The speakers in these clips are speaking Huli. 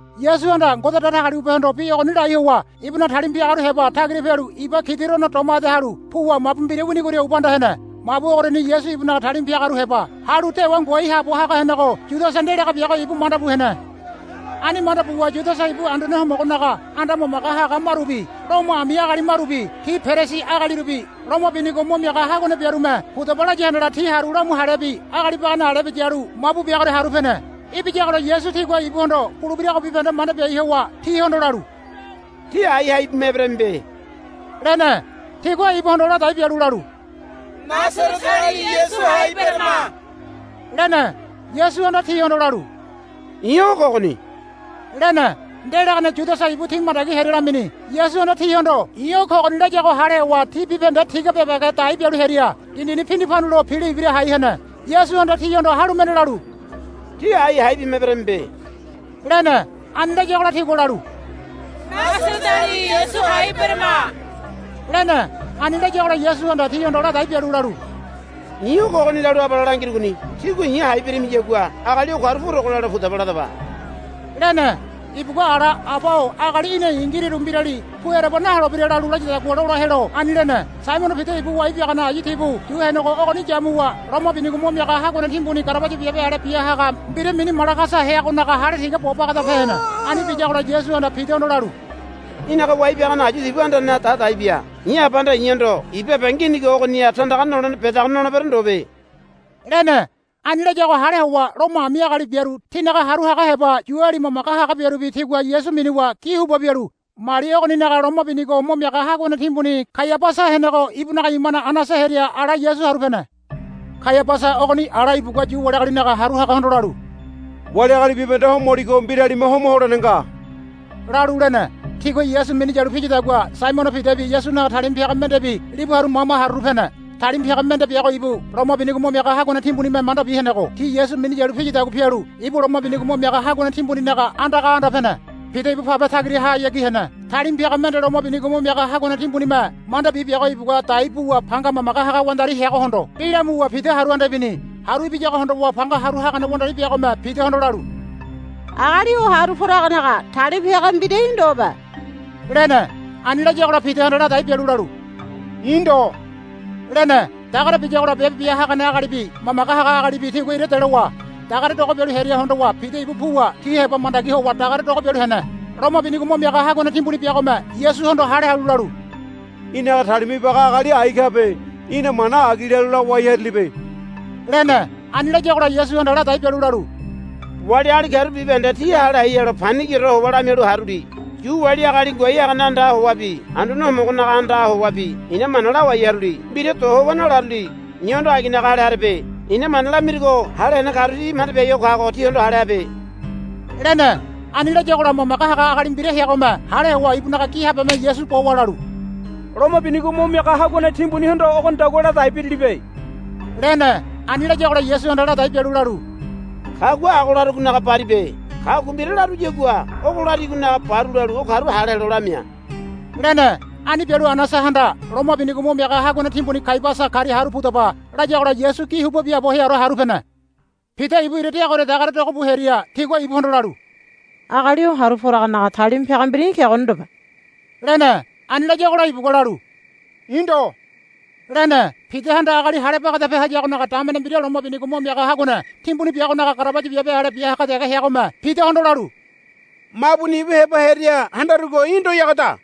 Yasuhanda Ngode Datagaliwabehondo bi ogoni lai howa ibunaga talima piagaru heba tagira pialu iba Kidirono doma ede halu puwa mabu mbira winigoria ubanda hene. Mabu ogoriani Yasu ibunaga talima piagaru heba halu dewa ngoai haabo haga henego Yudasa ndelaga biago ibu manda bu hene. Ani manda buwa Yudasa ibu Anduane Homogonaga anda mamage haga marubi Lomo ami agali marubi ti Perisi agalirubi loma binigo mo miaga haguane biarume pudaba laya handala ti haru lamu halebi agali bagane alebi yalu mabu biagoria haru pene. Ibiyagola Yasu tigua ibuhondo bulebirago bibahende manda biai howa tihondo lalu, Tí ái hai bima eberamibe, lene. Tigua ibuhondo ladai bialu lalu, Nasareteali Yasu hai berama, lene. Yasuhanda tihondo lalu, I̱ o kogoni, lene. Ndelagane Yudasa ibu ti mandagi hearia lamini. Yasuhanda tihondo, I̱ o kogoni, layago hale howa ti bibahende tiga bebege dai bialu hearia dindini pindipandulo pilo ibira hai hene. Yasuhanda tihondo halu mende lalu, Tí ái hai bima eberamibe, lene. Ani layagola tigua lalu, Nasareteali Yasu hai berama, lene. Ani layagola Yasuhanda tihondo ladai bialu lalu, I̱ o kogoni lalu abale langirugoni. Tígua i̱ hai beramiyagua agali o karu purogo lelo pudaba ladaba, lene. Ibugua ala, Aba-o agali í̠na i̱ ngiriru mbirali pu ereba naholebira, lalu layadagua lola helo ani lene. Saimono Pida ibu wai biagane ayu tibu yu henego ogoni yamuwa loma binigo mo miaga haguane timbuninaga garabaya biabe ale bia haga mbira mini Malagasa heagonaga hale tiga bo bagada pe hene. Ani biyagola Yasuhanda Pidahondo lalu, Í̠naga wai biagane ayu tibu andaneha da dai bia. I̱ Abahanda i̱hondo ibabe nginigo ogoniha tandaga nolene bedago nolebero ndobe, lene. Ani layago hale howa Lomo ami agali biaru tinaga haru haga heba Yuali mamage haga biarubi tigua Yasu minuwa gi huba bialu mali ogoninaga loma binigo mo miaga haguane timbuni Kaiabasa henego ibunaga imane Anasa hearia ala Yasu haru pene. Kaiabasa ogoni ala ibugua Yu wali agalinaga haru hagahondo lalu, Wali agali bibahende homoligo mbiralime homa holene nga, lalu lene. Tigua Yasu minu yalu piyadagua Saimono Pidabi Yasunaga talima piaga mendebi libu haru mama haruru pene. Talima piaga mende biago ibu loma binigo mo miaga haguane timbunime mandabi henego ti Yasu minu yalu piyadagua pialu ibu loma binigo mo miaga haguane timbuninaga andaga anda pene. Pida ibu pabe tagirahayagi hene. Talima piaga mende loma binigo mo miaga haguane timbunime mandabi biago ibugua dai buwa panga mamage haga wandari heagohondo bi lamuwa Pida haru anda ibini. Haru ibiyago hondowa panga haru hagane wandari biagome Pidahondo lalu, Agali o haru poragonaga talima piaga mbira í̠ ndobe, lene. Ani layagola Pidahanda ladai bialu lalu, I̱ ndo, lene. Dagare biyagola biabe bia hagane agalibi mamage haga agalibi tigua ira delowa dagare dogo bialu hearia hondowa Pida ibu puwa ti heba mandagi howa dagare dogo bialu hene. Loma binigo mo miaga haguane timbuni biagome Yasuhondo hale halu lalu, Í̠naga talima ibaga agali ai kabe. Í̠na mana agi lalu lawai harilibe, lene. Ani layagola Yasuhanda ladai bialu lalu, Wali agali karu bibahende ti hale hai helo panigiore howa lamialu haruli. Yu wali agali ngoai hagane andaha howabi Anduane Homogonaga andaha howabi i̱na mana lawai haruli. Mbira do howa nalaruli. I̱hondo aginaga hale harebe. I̱na mana lamirugo hale hene karu ti manda biai kago tihondo hale habe, lene. Ani layagola mamage haga agali mbira heagome hale howa ibunaga gi habeme Yasu bowa lalu, Loma binigo mo miaga haguane timbunihondo ogonidagua ladai birilibe, lene. Ani layagola Yasuhanda ladai bialu lalu, Kagua ago larugonaga baribe. Kagua mbira laruyagua ogo larigonaga baru lalu o karu hale helo lamia, lene. Ani bialu Anasahanda, Loma binigo mo miaga haguane timbuni Kaiabasa karia haru pudaba, layagola Yasu gi huba biaabo heaore haru pene. Pida ibu ira deagoria dagare dogo bu hearia tigua ibuhondo lalu, Agali o haru poragonaga talima piaga mbira í̠ kegoni ndobe, lene. Ani layagola ibugua lalu, I̱ ndo, lene. Pidahanda agali hale bagadape hayagonaga damene mbira loma binigo mo miaga haguane timbuni biagonaga garabaya biabe ale bia haga dege heagome Pidahondo lalu, Mabuni ibu heba heria handarugo í̠ ndoyagoda,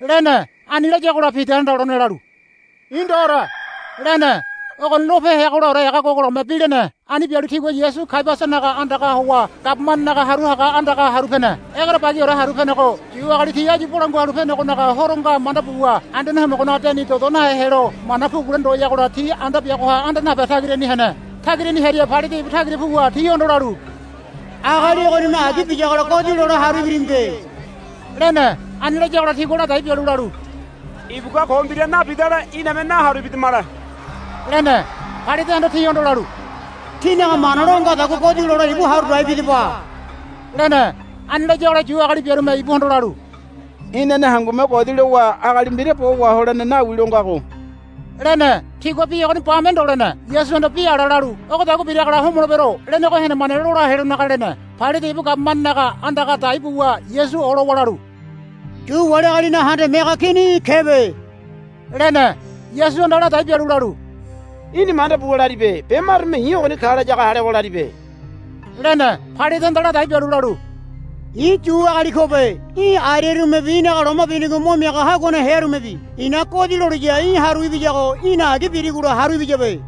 lene. Ani layagola Pidahanda lone lalu, I̱ ndoore, lene. Ogoni lope heagolaore ega gogologome bi lene. Ani bialu tigua Yasu Kaiabasanaga andaga howa gabumanenaga haru haga andaga haru pene. Egerebagiore haru penego Yu agali ti áyu Bolangua Halu Penegonaga Horo nga manda buwa Anduane Homogonaga deni dodo nahe helo mana pugule ndoyagola ti anda biagoha anda nape tagirani hene. Tagirani hearia Pailate ibu tagira puwa tihondo lalu, Agali ogonime agi biyagola godi lole haru ibirimibe, lene. Ani layagola tigua ladai bialu lalu, Ibugua ko mbira nabidale iname naharu ibidamale, lene. Pailatehanda tihondo lalu, Tínaga mana lo ngadagua godi lole ibu haru dai bidaba, lene. Ani layagola Yu agali biarume ibuhondo lalu, Inane hangume godi lowa agali mbira bo waholene nawi lo ngago, lene. Tigua bi ogoni bame ndo lene. Yasuhanda bi ala lalu, Ogodagua biragola homolebero, lenego henemane lola helonaga lene. Pailate ibu gabumanenaga andaga dai buwa Yasu olowa lalu, Yu wali agalinaga Handame Haga Kini í̠ kebe, lene. Yasuhanda ladai bialu lalu, Í̠ni manda buwa laribe be marume i̱ ogoni ka layago hale howa laribe, lene. Pailatehanda ladai bialu lalu, I̱ Yu agali kobe. Í̠ ariarumebi í̠naga loma binigo mo miaga haguane hearumebi i̱na godi loliya í̠ haru ibiyago í̠na agi birigola haru ibiyabe,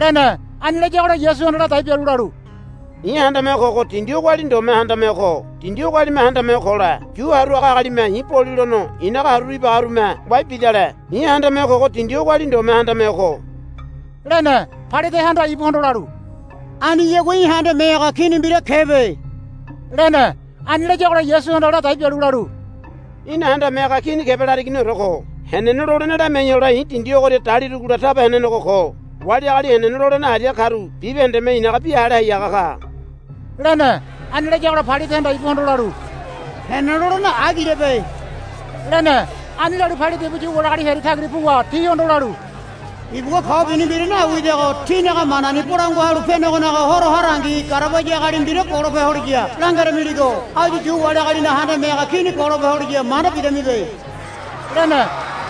lene. Ani layagola Yasuhanda ladai bialu lalu, I̱ handame ho kogo dindi ogoali ndome handame ho ko. Dindi ogoalime handame ho kole Yu haru haga agalime i̱ bolilono i̱naga haruru ibaganerume wai bidale. I̱ handame ho kogo dindi ogoali ndome handame ho ko, lene. Pailatehanda ibuhondo lalu, Aniyagua í̠ handame haga kini mbira kebe, lene. Ani layagola Yasuhanda ladai bialu lalu, Í̠na handame haga kini kebe larigoniore ko. Henene lolene lamiai hole i̱ dindi ogoria dalirugola taba henenego ko. Wali agali henene lolene aria karu bibahendeme i̱naga bi hale hai haga ka, lene. Ani layagola Pailatehanda ibuhondo lalu, Henene lolene agilebe, lene. Ani lalu Pailate ibu Yu wali agali hearia tagira puwa tihondo lalu, Ibugua ko bini mbira nawidago tínaga manani Bolangua Halu Penegonaga Horo harangi garabaya agali mbira golope holiya langeramiligo áyu Yu wali agalinaga handame haga kini golope holiya manda bidamibe, lene.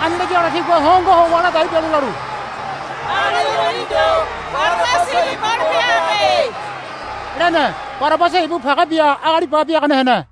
Ani layagola tigua hongo howa ladai bialu lalu, Agali ogoni ndo. Barabasa ibu golope habe, lene. Barabasa ibu page bia agali ba biagane hene.